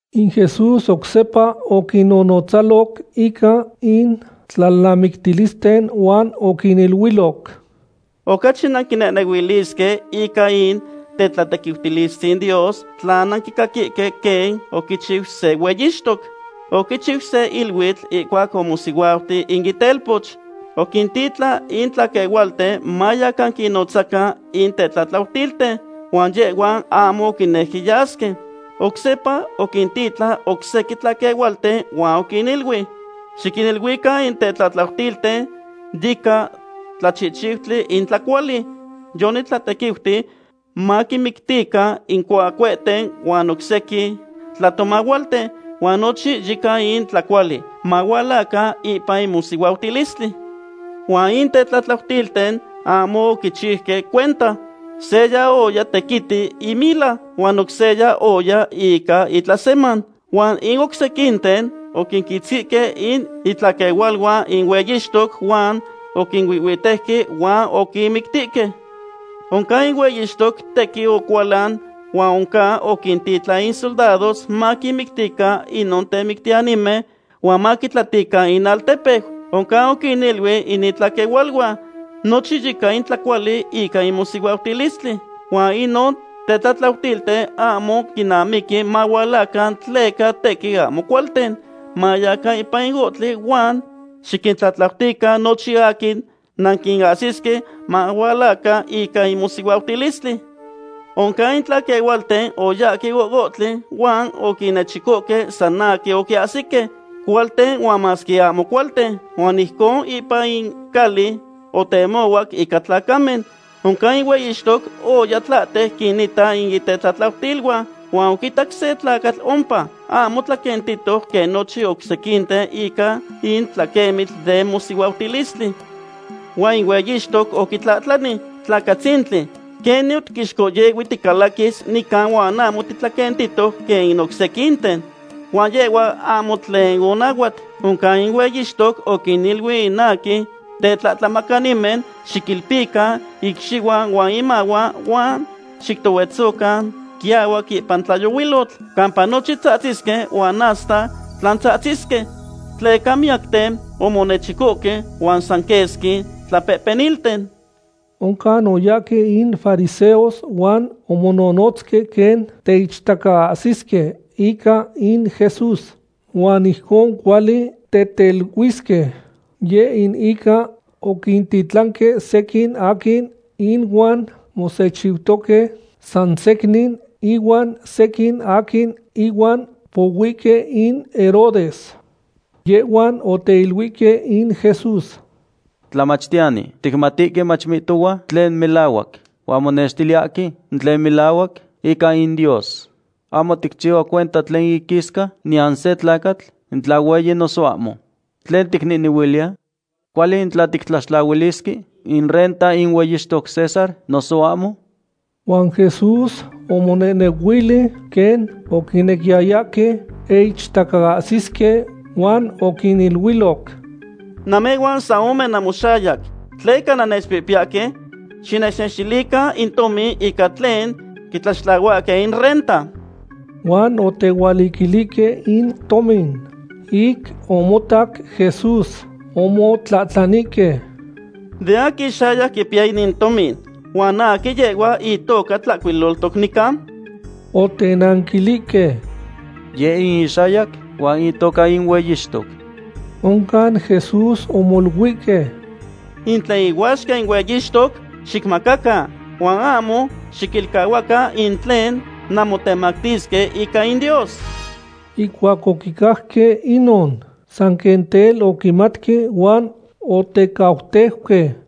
In Jesús oc sepa oquinnonotzaloc ica in tlalnamictilisten huan oquiniluiloc: ―Ocachi nanquinehnehuilisque ica in tetlatequiutilistzin Dios tla nanquicaquihque quen oquichiu se hueyixtoc. Oquichiu se iluitl ihcuac omosihuauti in itelpoch. Oquintitlan in tlaquehualten mayacan quinnotzacan in tetlatlautilten, huan yehhuan ahmo oquinejque yasque. Oc sepa oquintitlan oc sequin tlaquehualten huan oquiniluic: “Xiquiniluican in tetlatlautilten yica tlachihchiutli in tlacuali. Yonitlatequiuti maquinmictican in cuacuehten huan oc sequin tlatomahualten, huan nochin yica in tlacuali. Mahualacan ipan in mosihuautilistli.” Huan in tetlatlautilten ahmo oquichiuque cuenta. Seya oya tequiti imila, huan oc seya oya ica itlaseman. Huan in oc sequinten oquinquitzquihque in itlaquehualuan in hueyixtoc huan oquinuihhuitejque huan oquinmictihque. Oncan in hueyixtoc tequin ocualan huan oncan oquintitlan in soldados maquinmictican inon temictiyanimen huan maquitlatican inaltepeu. Oncan oquiniluic in itlaquehualuan: “Nochin yica in tlacuali ica in mosihuautilistli, huan inon tetlatlautilten ahmo quinamiqui mahualacan tleca tequin ahmo cualten. Mayacan ipan ohtli huan xiquintlatlautican nochin aquin nanquinahsisque mahualacan ica in mosihuautilistli.” Oncan in tlaquehualten oyahque ohohtli huan oquinnechicohque san aquin oquiahsique, cualten huan masque ahmo cualten. Huan ijcon ipan in cali otemohuac ica tlacamen. ’Oncan in hueyixtoc oya tlahtec quinita in itetlatlautiluan. Huan oquitac se tlacatl ompa, ahmo tlaquentihtoc quen nochin oc sequinten ica in tlaquemitl den mosihuautilistli. Huan in hueyixtoc oquitlahtlani: “Tlacatzintli, ¿quenin otiquixcohyehui ticalaquis nica huan ahmo titlaquentihtoc quen in oc sequinten?” Huan yehhua ahmo tlen onahuat. Oncan in hueyixtoc oquiniluic in aquin tetlahtlamacanimen: “Xiquilpican icxihuan huan imahuan huan xictohuetzocan quiahuac ipan tlayohuilotl, campa nochin tzahtzisque huan hasta tlantzahtzisque.” Tleca miyacten omonechicohque, huan san quesqui tlapehpenilten. Oncan oyahque in fariseos huan omononotzque quen teichtacaahsisque ica in Jesús, huan ijcon cuali teteluisque. Yeh in ica oquintitlanque sequin aquin inuan mosechiutoque, san secnin ihuan sequin aquin ihuan pohuihque in Herodes. Yehhuan oteiluihque in Jesús: ―Tlamachtiyani, ticmatihque mach mihtohua tlen melahuac, huan monextiliyahque in tlen melahuac ica in Dios. Ahmo ticchihua cuenta tlen iquisca niyan se tlacatl, in tla hueyi noso ahmo. ¿Tlen ticnehnehuiliya? ¿Cuali in tla tictlaxtlahualisque in renta in hueyixtoc César noso ahmo? Huan Jesús omonehnehuili quen oquinequiyayahque teichtacaahsisque, huan oquiniluiloc: ―Namehhuan san ome namoxayac. ¿Tleca nannechpihpiyahque? Xinechnextilican in tomin ica tlen quitlaxtlahuahque in renta. Huan otehualiquilihque in tomin. Ic omotac Jesús, omotlahtlanihque: ―¿De aquin ixayac quipiya inin tomin, huan aquin yehhua itoca tlahcuilohtoc nica? Otenanquilihque: ―Yeh in ixayac huan itoca in hueyixtoc. Oncan Jesús omoluihque: ―In tlen ihuaxca in hueyixtoc, xicmacacan, huan ahmo xiquilcahuacan in tlen nanmotemactisque ica in Dios. Ihcuac oquicajque inon, san quen tel oquimatque huan otecauteuque.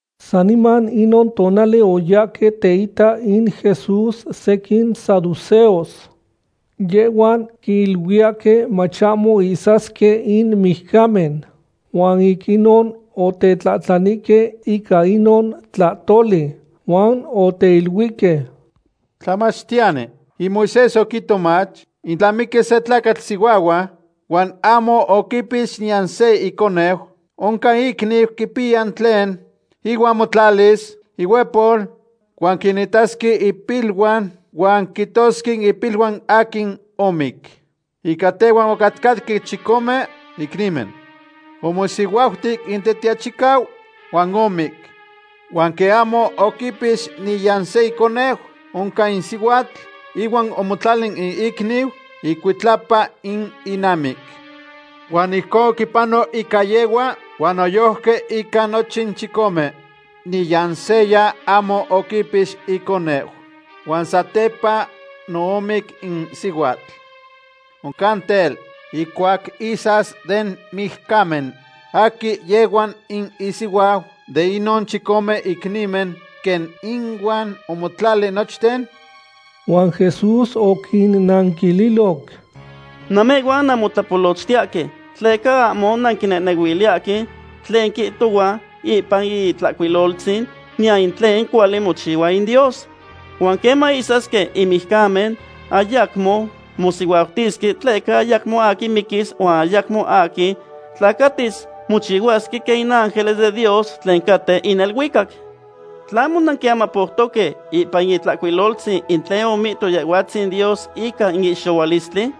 Saniman inon tonali oyahque teita in Jesús sequin saduceos. Yehhuan quiluiyahque mach ahmo ihsasque in mijcamen. Huan ic inon otetlahtlanihque ica inon tlahtoli. Huan oteiluihque: ―Tlamachtiyani, in Moisés oquihto mach in tla miquis se tlacatl sihuahua, huan ahmo oquipix niyan se iconeu, oncan iicniu quipiya tlen ihuan motlalis ihuehpol huan quinitasque impiluan huan quihtosque ipiluan aquin omic. Ica tehhuan ocatcahque chicome icnimen. Omosihuauti in tetiachicau huan omic. Huan quen ahmo oquipix niyan se iconeu, oncan in sihuatl ihuan omotlali in icniu icuitlapa in inamic. Huan ijcon oquipanoc ica yehhua, huan noyojqui ica nochin chicome. Niyan seya ahmo oquipix iconeu. Huan satepa no omic in sihuatl. Oncan tel, ihcuac ihsas den mijcamen, ¿aquin yehhua in isihuau de inon chicome icnimen, quen inuan omotlali nochten? Huan Jesús oquinnanquililoc: ―Namehhuan nanmotlapolochtiyahque, tleca ahmo nanquinehnehuiliyahque tlen quihtohua ipan in Itlahcuiloltzin, niyan in tlen cuali mochihua in Dios. Huan queman ihsasque in mijcamen, ayacmo mosihuautisque tleca ayacmo aquin miquis huan ayacmo aquin tlacatis. Mochihuasque quen in ángeles den Dios tlen caten in neluicac. ¿Tlahmo nanquiamapoutoque ipan in Itlahcuiloltzin in tlen omihto Yehhuatzin Dios ica in ihxohualistli?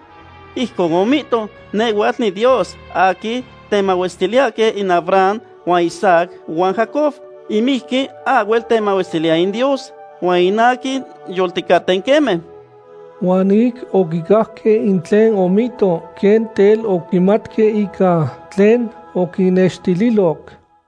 Ijcon omihto: “Nehhuatl niDios aquin temahuestiliyahque in Abraham huan Isaac huan Jacob.” In mijqui ahhuel temahuestiliya in Dios huan in aquin yolticaten, queme. Huan ic oquicajque in tlen omihto, quen tel oquimatque ica tlen oquinnextililoc.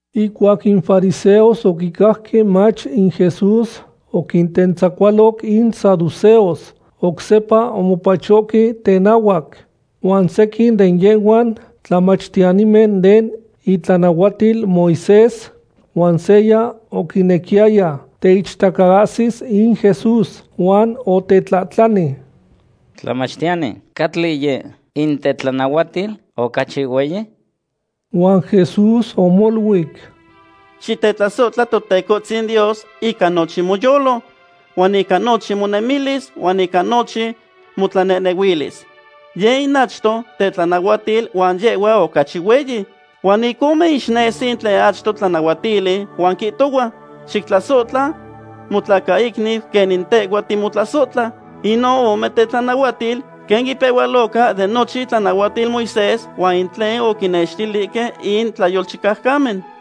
Ihcuac in fariseos oquicajque mach in Jesús oquintentzacualoc in saduceos, oc sepa omopachohque tenahuac. Huan sequin de yehhuan tlamachtiyanimen den itlanahuatil Moisés. Huan seya oquinequiyaya teichtacaahsis in Jesús, huan otetlahtlani: ―Tlamachtiyani, ¿cahtli yeh in tetlanahuatil ocachi hueyi? Huan Jesús omoluic: ―“Xitetlasohtla Totecohtzin Dios ica nochin moyolo, huan ica nochin monemilis, huan ica nochin motlanehnehuilis.” Yeh in achto tetlanahuatil huan yehhua ocachi hueyi. Huan ic ome ixnesi in tlen achto tlanahuatili, huan quihtohua: “Xictlasohtla motlacaicniu quenin tehhua timotlasohtla.” Inon ome tetlanahuatil quen ipehualoca de nochin itlanahuatil Moisés huan in tlen oquinextilihque in tlayolchicaucamen.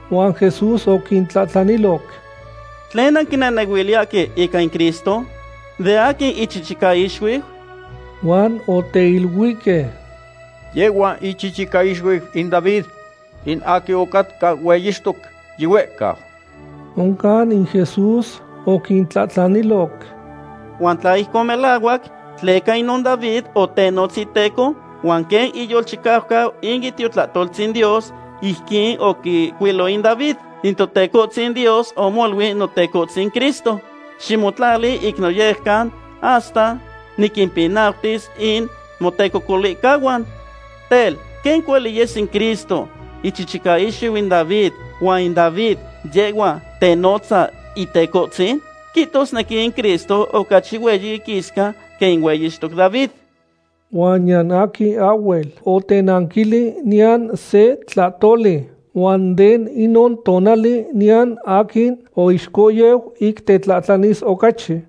huan Jesús oquintlahtlaniloc: ―¿Tlen nanquinehnehuiliyahque ica in Cristo? ¿De aquin ichichicaixuiu? Huan oteiluihque: ―Yehhua ichichicaixuiu in David, in aquin ocatca hueyixtoc yihuehcau. Oncan in Jesús oquintlahtlaniloc: ―Huan tla ijcon melahuac, ¿tleca inon David otenotz iteco? Huan quen oquiyolchicau in Itiotonaltzin Dios, ijquin oquihcuilo in David: In Totecohtzin Dios omoluic Notecohtzin Cristo: “Ximotlali ic noyejcan hasta niquimpinautis in motecocolihcahuan.” Tel, ¿quen cuali yes in Cristo ichichicaixuiu in David, huan in David, yehhua tenotza Itecohtzin? Quihtosnequi in Cristo ocachi hueyi iquisca quen in hueyixtoc David. Huan niyan aquin ahhuel otenanquili niyan se tlahtoli, huan de inon tonali niyan aquin oixcohyeu ic tetlahtlanis ocachi.